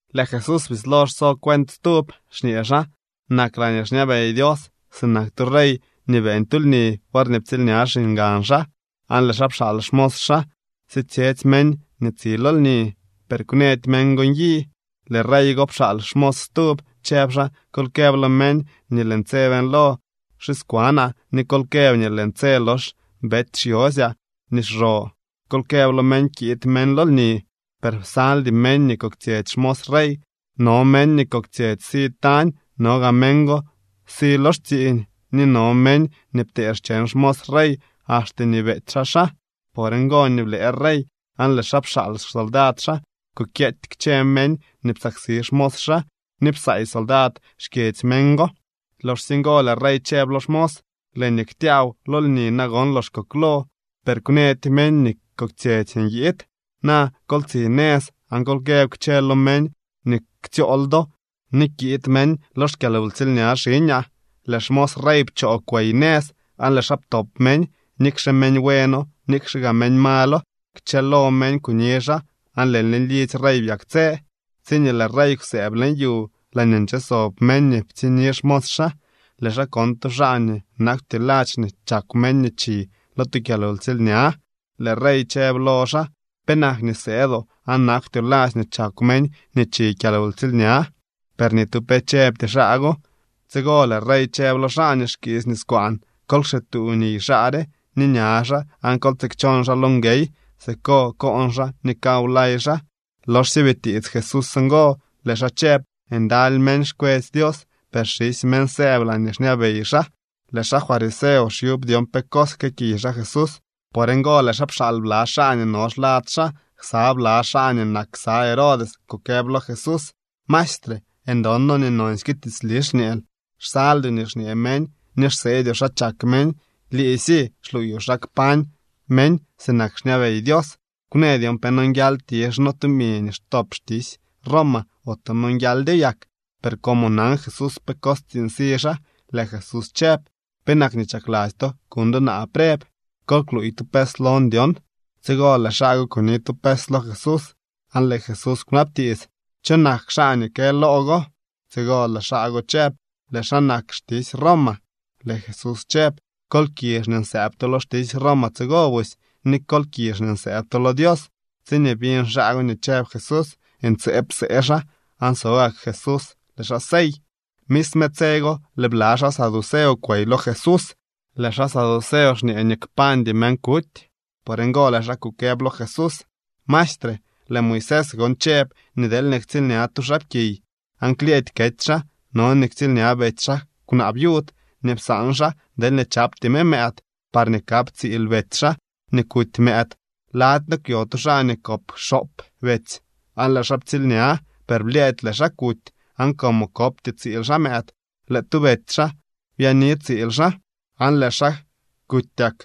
Lëë Jesús bislo xso cuent stub, xñee xaa: —Nak laañee xñabey Dios sinak tu rey nii beeñ tu lni worñee ptsiilña xiñgan xaa. Aan lëë xaa pxaal xmos xaa sitsyetsy meñ nii tsi lo lni, per kwnëdy meñ go nyi. Lëë rey go pxaal xmos stub, chëb xaa: “Kol këb lo meñ nii lëën tse beeñlo xixkwanaa, ni kol këb nii lëën tse lox bety xyosyaa nii xro. Kol këb lo meñ kiid meñ lo lni.” Per psaldy meñ nii koktsyetsy xmos rey. No meñ nii koktsyetsy si tañ, no gaa meñ go si lo xtsiiñ, ni no meñ nii ptee xcheñ xmos rey, axte nii beety xaa xaa. Por ngo nii blëë rey, aan lëë xaa pxaal xsoldad xaa kukyeety kchë meñ nii psaksi xmos xaa ni psaay soldad xkyedzy meñ go. Loxsye ngo lëë rey chëb lo xmos: “Lëë nii ktyaaw lo lni nagon lox koklo, per kwnëdy meñ nii koktsyetsy nyiid. Na kol tsi nëz aan kol këb kchë lo meñ nii ktsyool do nii kiid meñ lo xkyalwtsiilña xiñaa.” Lëë xmos rey pchoo kwey nëz, aan lëë xaa ptop meñ. Nikxe meñ bueno, nikxe gaa malo, kchëlo meñ kuni xaa aan lëë lidzy rey byaktsë. ’Tsiñee lëë rey kwsëëb leñ yu laañee nche sob meñ nii ptsiñni xmos xaa, lëë xaa kon tu xaa nii nakwty ladx nii chakw meñ nii chi lo tu kyalwtsiilña. Lëë rey chëb lo xaa: “¿Penak nii sëëdoo aan nakwtyoo ladx nii chakw meñ nii chi kyalwtsiilña?” Per ni tu pe chëbty xaa go. Tsigo lëë rey chëb lo xaa nii xkiisy niskwaan: “Kol kxituu niy xaa re ni ña xaa, aan kol tsikchon xaa lo nguey. Siko koon xaa ni kaw lay xaa.” Loxsye bitiits Jesús ngo, lëë xaa chëb: —Ndaly meñ xkwetsy Dios, per xisy meñ sëëb laañee xñabey xaa. Lëë xaa fariseo xyub dyon pe cos jkëëkiy xaa Jesús. Por ngo lëë xaa pxaal bla xaa nii no xlad xaa ksa bla xaa nii nak ksa Herodes kukëb lo Jesús: —Maestre, ndon noo nii nonsyke tiitsli xñeel. Xsaldyoo nii xñee meñ ni xseedyoo xa chak meñ. Liisy xluuyoo xa kpañ meñ sinak xñabey Dios. Kwnë dyon pe nonguial tizh noo tumi nii xtop xtisy Roma ote nonguialdyo yak. Per como nan Jesús pe cos tsiiñ si xaa, lëë Jesús chëb: —¿Penak nii chakladzy to kuñ do naa preb? Kol kluuy tu pes lon dyon. Tsigo lëë xaa go kuni tu pes lo Jesús. Aan lëë Jesús kwnabtiits: —¿Cho nak xaa nii kë loo go? Tsigo lëë xaa go chëb: —Lëë xaa nak xtisy Roma. Lëë Jesús chëb: —Kol kizh nii nsëëb to lo xtisy Roma tsigo busy, ni kol kizh nii nsëëb to lo Dios. Tsiñee biñ xaa go nii chëb Jesús, ntseeb psee xaa, aan so gak Jesús, lëë xaa sey. Misme tse go lëë bla xaa saduceo kwey lo Jesús. Lëë xaa saduceo xñee nii kpañdy meñ kuty. Por ngo lëë xaa kukëb lo Jesús: —Maestre, lëë Moisés gon chëb nii deelñee ktsiilña tu xaapkiy aan klyëëdy kety xaa, no nii ktsiilña betsy xaa kwnaa viud nii psaan xaa deelñee chapty me mëëd, parñee kap tsiil betsy xaa nii kuty mëëd. Lady noo kwyo tu xaa nii kop xoop betsy, aan lëë xaa ptsiilña. Per blyëëdy lëë xaa kuty, aan como kopty tsiil xaa mëëd, lëë tu betsy xaa byaani tsiil xaa, aan lëë xaa kutyak.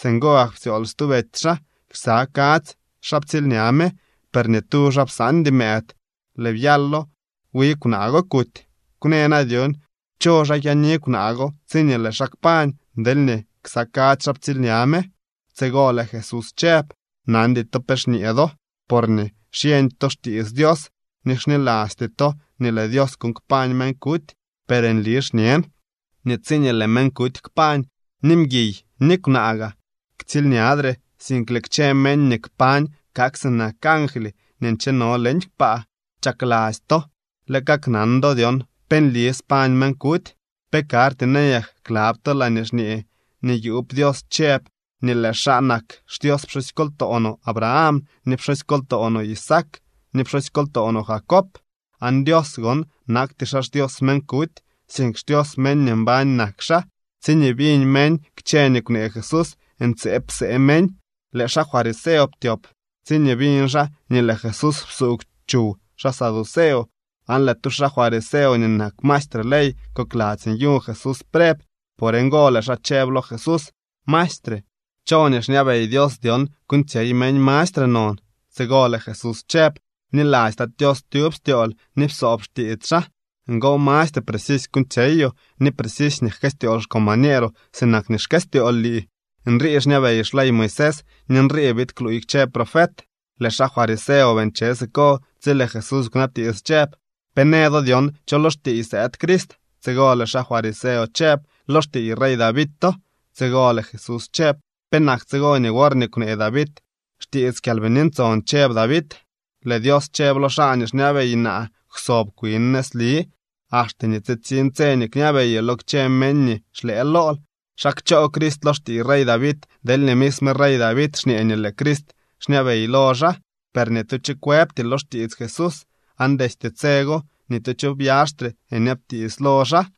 Singo gak ptsyool stu betsy xaa. Ksa kadzy xaa ptsiilña me, per ni tu xaa psaandy mëëd. Lëë byalo wi kwnaa go kuty. Kwnë na dyon cho xaa kyaani kwnaa go tsiñee lëë xaa kpañ, deelñee ksa kadzy xaa ptsiilña me. Tsigo lëë Jesús chëb: —Nandy to pe xñee do, porñee xyeñdy to xtiits Dios ni xnilasty to nii lëë Dios kuuñ kpañ meñ kuty. Per nli xñen nii tsiñee lëë meñ kuty kpañ, ni mguiy ni kwnaa gaa ktsiilñadre, sink lëë kchë meñ nii kpañ kak sinak angly nii ncheno leñ kpaa. Chakladzy to lë kaknan do dyon pe nli spañ meñ kuty. ¿Pe karty nayak klab to laañee xñee nii yuub Dios chëb nii lëë xaa nak xDios pxusykoltoo no Abraham, ni pxusykoltoo no Isaac ni pxusykoltoo no Jacob? Aan Dios gon nakty xaa xDios meñ kuty, sink xDios meñ nii mbañ nak xaa. Tsiñee biñ meñ kchë nii kwnee Jesús, ntseeb psee meñ. Lëë xaa fariseo ptyop tsiñee biñ xaa nii lëë Jesús psuugw chuw xaa saduceo. Aan lëë tu xaa fariseo nii nak maestre ley kokladzy nyuñ Jesús preb. Por ngo lëë xaa chëb lo Jesús: —Maestre, ¿cho nii xñabey Dios dyon kuuñtsyey meñ mastre non? Tsigo lëë Jesús chëb: —“Bniladzy Tat Tios tyub styool ni psoob xtiits xaa.” Ngo mastre precisy kuuñtsyeyoo. Ni precisy nii jkëstyool xcombañeeroo sinak nii xkëstyool lii. Nrii xñabey xley Moisés ni nrii biid kluuy kchë profet. Lëë xaa fariseo bii nche siko tsi lëë Jesús kwnabtiits chëb: —¿Pe në do dyon cho lo xtiiy sëëd Crist? Tsigo lëë xaa fariseo chëb: —Lo xtiiy rey Davito. Tsigo lëë Jesús chëb: —¿Penak tsigo nii worñee kwnee David xtiits Kyalbini Ntson, chëb David: Lëë Dios chëb lo xaa nii xñabey naa: “Kwsob kwin nëzli, axte nii tsitsiñ tse nii kñabeyoo lo kchë meñ nii xlëë lool”? ¿Xa kchoo Crist lo xtiiy rey David deelñee misme rey David xñee nii lëë Crist xñabey lo xaa? Per ni tu cho kwëbty lo xtiits Jesús, aan destye tse go ni tu cho byaxtre nyabtiits lo xaa.